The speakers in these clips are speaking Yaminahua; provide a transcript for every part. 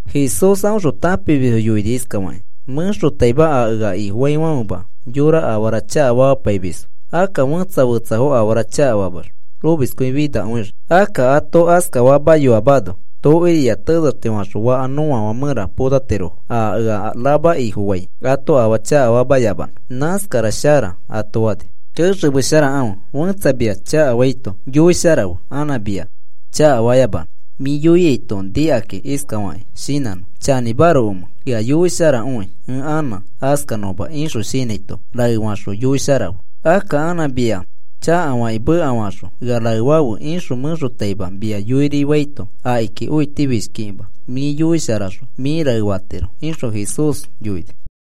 Jesús aõxõ tãpimisfo yoini iskafakĩ: “Mẽxotaima a ea Ifofaafãfema yorafo afara chakafamapaimisfo. Akka fẽtsa fetsafo afara chakafamax omiskõifinakõixii. Akka ato askafamayoamano, tokiriya tenexti faxõ fakafã nõafã mẽra potatirofo a ea rama Ifofaifo ato afaa chakafamayamanõ. Nãskara shara,” ato fani. “Kexemesharakãfe. Fẽtsa mia chakafaito yoisharafe anã mia chakafanõma. Mĩ yoiaito nikakĩ iskafakĩ shinãnõ: ‘Chanĩmarokomẽ ea yoisharakõi ẽ anã askanõma,’ ixõ shinãito raefaxõ yoisharafe. Akka anã mia chakafakĩ mekafaxõ, ea raefafe ixõ mẽxotaima mia yoiri faito akiki õitifishkikĩma mĩ yoisharaxõ mĩ raefatiro,” ixõ Jesús yoini.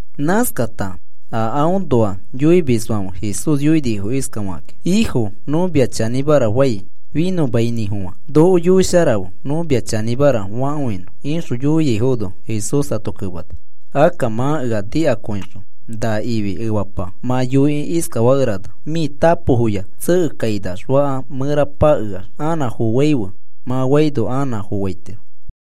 Nãskata a aõnoa yoimisfãfe Jesús yoinifo iskafakakĩ: “Ifo, nõ mia chanĩmara fai finõmainĩfofã noko yoisharafe nõ mia chanĩmara fakõinõ,” ixõ yoiaifono, Jesús ato kemani: “Akka mã ea nikakõixõ na ifi efapa mã yoikĩ iskafakerana: ‘Mĩ tapofoya tsekekainax fakafã mẽra pakeax anã foaife,’ mã faino anã foaitiro.”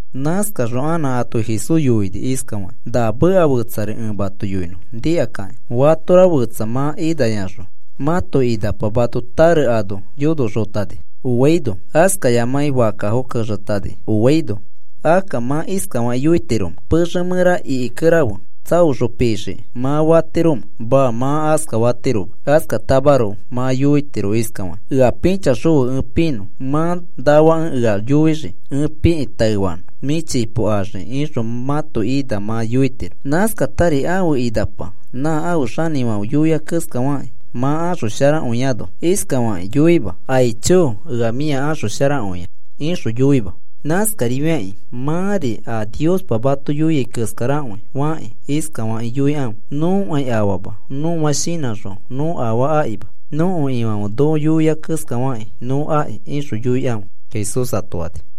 Nãskaxõ anã ato Jesús yoini iskafakĩ: “Na meka fetsari ẽ mato yoinõ nikakakĩ. Fatora fetsa mã inayaxõ mãto inapa mãto tare ano yonoxotani oaino askayamakĩ fakkafo kexetani oaino akka, ¿mã iskafakĩ yoitiromẽ: ‘Pexe mẽra ikikerafe tsaoxõ pixiki,’ mã fatiromẽ? Maa, mã askafatiroma. Askafatamaroko mã yoitiro iskafakĩ: ‘Ea pĩchaxõfe ẽ pinõ, mã nafakẽ ea yoixii ẽ pikĩ taefanõ, mĩ chipo axiki,’ ixõ mãto ina mã yoitiro. Nãskatari ãfe inapa nã ãfe xanĩfãfe yoia keskafakĩ mã axosharakõiano iskafakĩ yoima: ‘Aicho, ea mĩa axosharakõia,’ ixõ yoima. Nãskarifiakĩ mãri a Niospa mato yoia keskarakõi fakĩ iskafakĩ yoikãfe: ‘Nõkai afama, nõa shinãxõ nõ afaa akima. Nõko Ifãfe noko yoia keskafakĩ nõ aki,’ ixõ yoikãfe,” Jesús ato fani.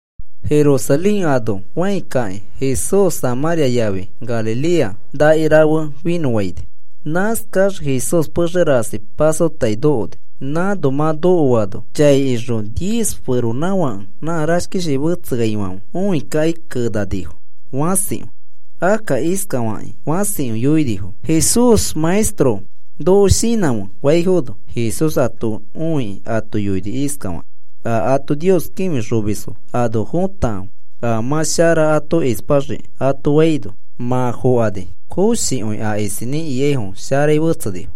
Jerusalén ano fãi kakĩ Jesús Samãria yafi Galilea xatsokama rafe finõfaini. Nãskax Jesús pexe rasi pasotai nokoni. Nãno mã nokoano chai ixõ diez feronãfake nã rashkishi fetseaifãfe õikakĩ kenanifo fãsikõi. Akka iskafakĩ fãsikõi yoinifo: “Jesús, Maestro, noko shinãfe,” faifono, Jesús ato õikĩ ato yoini iskafakĩ: “A ato Nios kĩfixomisfo ano fotakãfe, a mã shara ato ispaxiki,” ato faino, mã fokani koshikõi a isinĩ ikaifo sharai fetsenifo.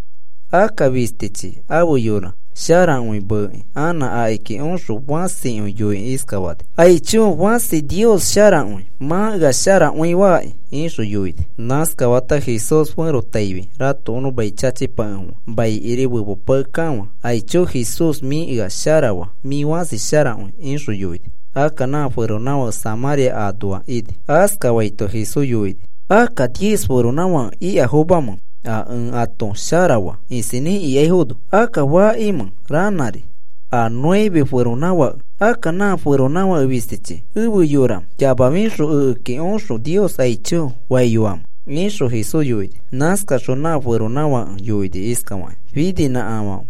Akka fistichi ãfe yora sharakõi meekĩ anã akiki oxõ fãsikõi yoikĩ iskafani: “¡Aicho, fãsi Nios sharakõi! Mã ea sharakõi faki,” ixõ yoini. Nãskafata Jesús ferotaifi ratokonõ mai chachipakefofã maikiri fepopakekafã. “¡Aicho Jesús, mĩ ea sharafaa! ¡Mĩ fãsi sharakõi!” ixõ yoini. Akka nã feronãfake Samãria anoa ini. Askafaito Jesús yoini: “¿Akka diez feronãfake ikafomamẽ a ẽ ato sharafa isinĩ ikaifono? ¿Akka fakimẽ ranãri a nueve feronãfake? ¿Akka na feronãfake fisti efe yora yamafixõ ekeki oxõ Nios aicho faiyoamẽ?” ixõ Jesús yoini. Nãskaxõ nã feronãfake yoini iskafakĩ: “Fininĩkafãfe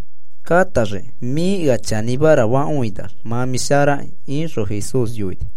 kãtaxiki. Mĩ ea chanĩmara fakõinax mã mĩ sharaki,” ixõ Jesús yoini.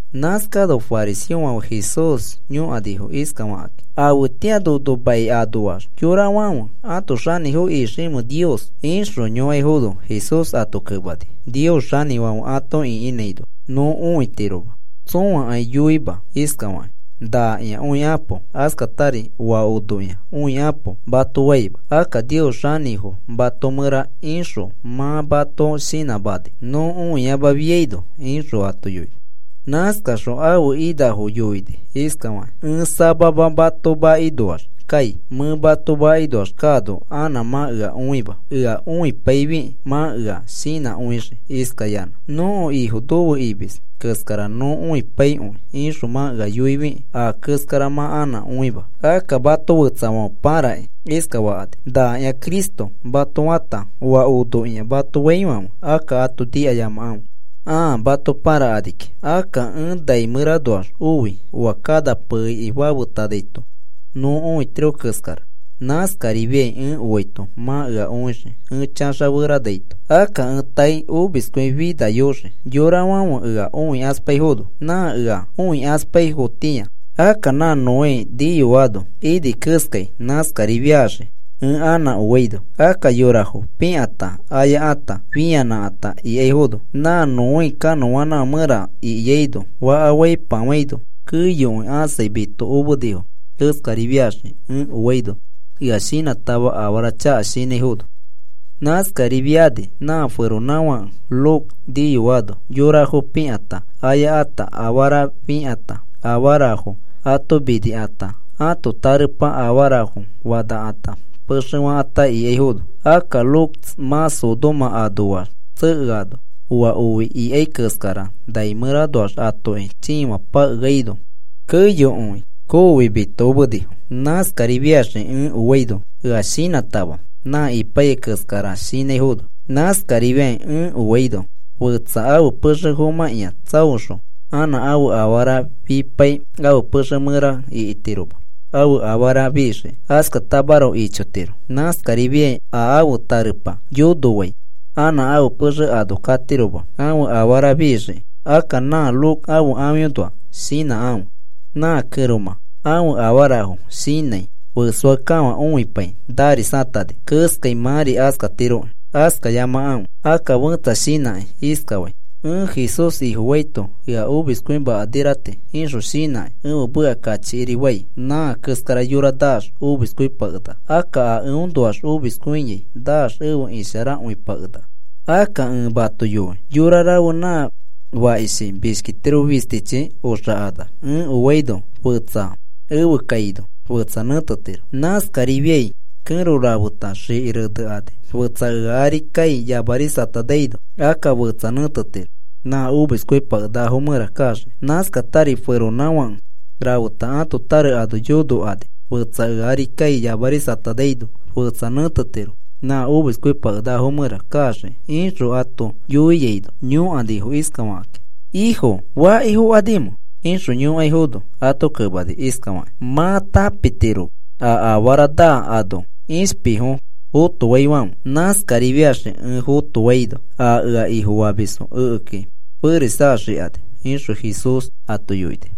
Nãskano fariseofãfe Jesús yõkanifo iskafakakĩ: “¿Afetĩa nono mai anoax yorafãfe ato xanĩfo iximẽ Nios?” ixõ yõkaifono, Jesús ato kemani: “Nios xanĩfãfe ato ĩkinãino nõ õitiroma. Tsõakai yoima iskafakĩ: ‘Nakĩa, õikapo,’ askatari, ‘Oa onokĩa, õikapo,’ mato faima. Akka Nios xanĩfo mato mẽra ixõ mã mato shinãmani nõ õiyamafiaino,” ixõ ato yoini. Nãskaxõ ãfe inãfo yoini iskafakĩ: “Ẽ samama mato makinoax kai. Mẽ mato makinoax kaano anã mã ea õima. Ea õipaifikĩ mã ea shinãkõixii iskayanã, ‘Nõko Ifo nofe imis keskara nõ õipaikõi,’ ixõ mã ea yoifikĩ a keskara mã anã õima. Akka mato fetsafãfe pãrakĩ iskafakani: ‘Nakĩa Cristo,’ mato fata, ‘Oa onokĩa,’ mato faifãfe, akka ato nikayamakãfe ãa mato pãrakani kiki. Akka ẽ nai mẽranoax oi oa kana peiki fafetanaito nõ õitiro keskara, nãskarifiai ẽ oaito mã ea õixii ẽ chaxaferanaito. Akka ẽ taei omiskõifinayoxii yorafãfe ea õikaspaifono nã ea õikaspaifotĩa. Akka nã Noé niyoano ini keskai nãskarifiaxii ẽ anã oaino. Akka yorafo pikãta ayakãta fĩanãkãta ikaifono, mã Noé kanõanãfã mẽra ikiano faka faipafãino, keyoi ãsai mitokomenifo. Nãskarifiaxii ẽ oaino ea shinãtama afara chaka shinãifono. “Nãskarifiani nã feronãfake Lot niyoano, yorafo pikãta, ayakãta, afarafo fĩkãta, afarafo ato minikãta ãto tarepa afarafo fanakãta pexe fakãta ikaifono, akka Lot mã Sodoma anoax tsekeano, oa oi ikai keskara nai mẽranoax atoki chiifã pakeaino keyokõi koofi mitokomenifo. “Nãskarifiaxii ẽ oaino, ea shinãkãtama nã ipaiyai keskara shinãifono. Nãskarifiakĩ ẽ oaino fetsa ãfe pexe fomãkĩa tsaoxõ anã ãfe afara fipai ãfe pexe mẽra ikitiroma ãfe afara fixiki. Askatamaroko ichotiro. Nãskarifiai a ãfe tarepa yonofai anã ãfe pexe ano katiroma ãfe afara fixiki. Akka nã Lot ãfe ãfiõnoa shinãkãfe. Nã kẽromã ãfe afarafo shinãi ifiakẽkafã õipai narisatani keskai mãri askatiroki. Askayamakãfe. Akka fẽtsa shinãkĩ iskafai: ‘Ẽ Jesús Ifofaito ea omiskõimakaniraiti,’ ixõ shinãkĩ ẽfe meka kachikiri fai. Nã keskara yora naax omiskõipakenaka. Akka aa eõnoax omiskõiai naax efe isharakõipakenaka. “Akka ẽ mato yoi, yora rafe nã fakishi mishkitiro fistichi oxakanax ẽ oaino fetsa efe kaino fetsa nẽtetiro. Nãskarifiai kẽro rafeta xiki renekani. Fetsa ea ari kai yamarisatanaino akka fetsa nẽtetiro nã omiskõipakenakafo mẽra kaxiki. Nãskatari feronãfake rafeta ãto tare ano yonokani, fetsa ea ari kai yamarisatanaino, fetsa nẽtetiro nã omiskõipakenakafo mẽra kaxiki,” ixõ ato yoiaino, yõkanifo iskafakakĩ: “Ifo, ¿faki fokanimẽ?” ixõ yõkaifono ato kemani iskafakĩ: “Mã tãpitiro a afara naa ano ishpifo fotofaifãfe. Nãskarifiaxii ẽ fotofaino a ea Ifofamisfo ekeki ferisaxakani,” ixõ Jesús ato yoini.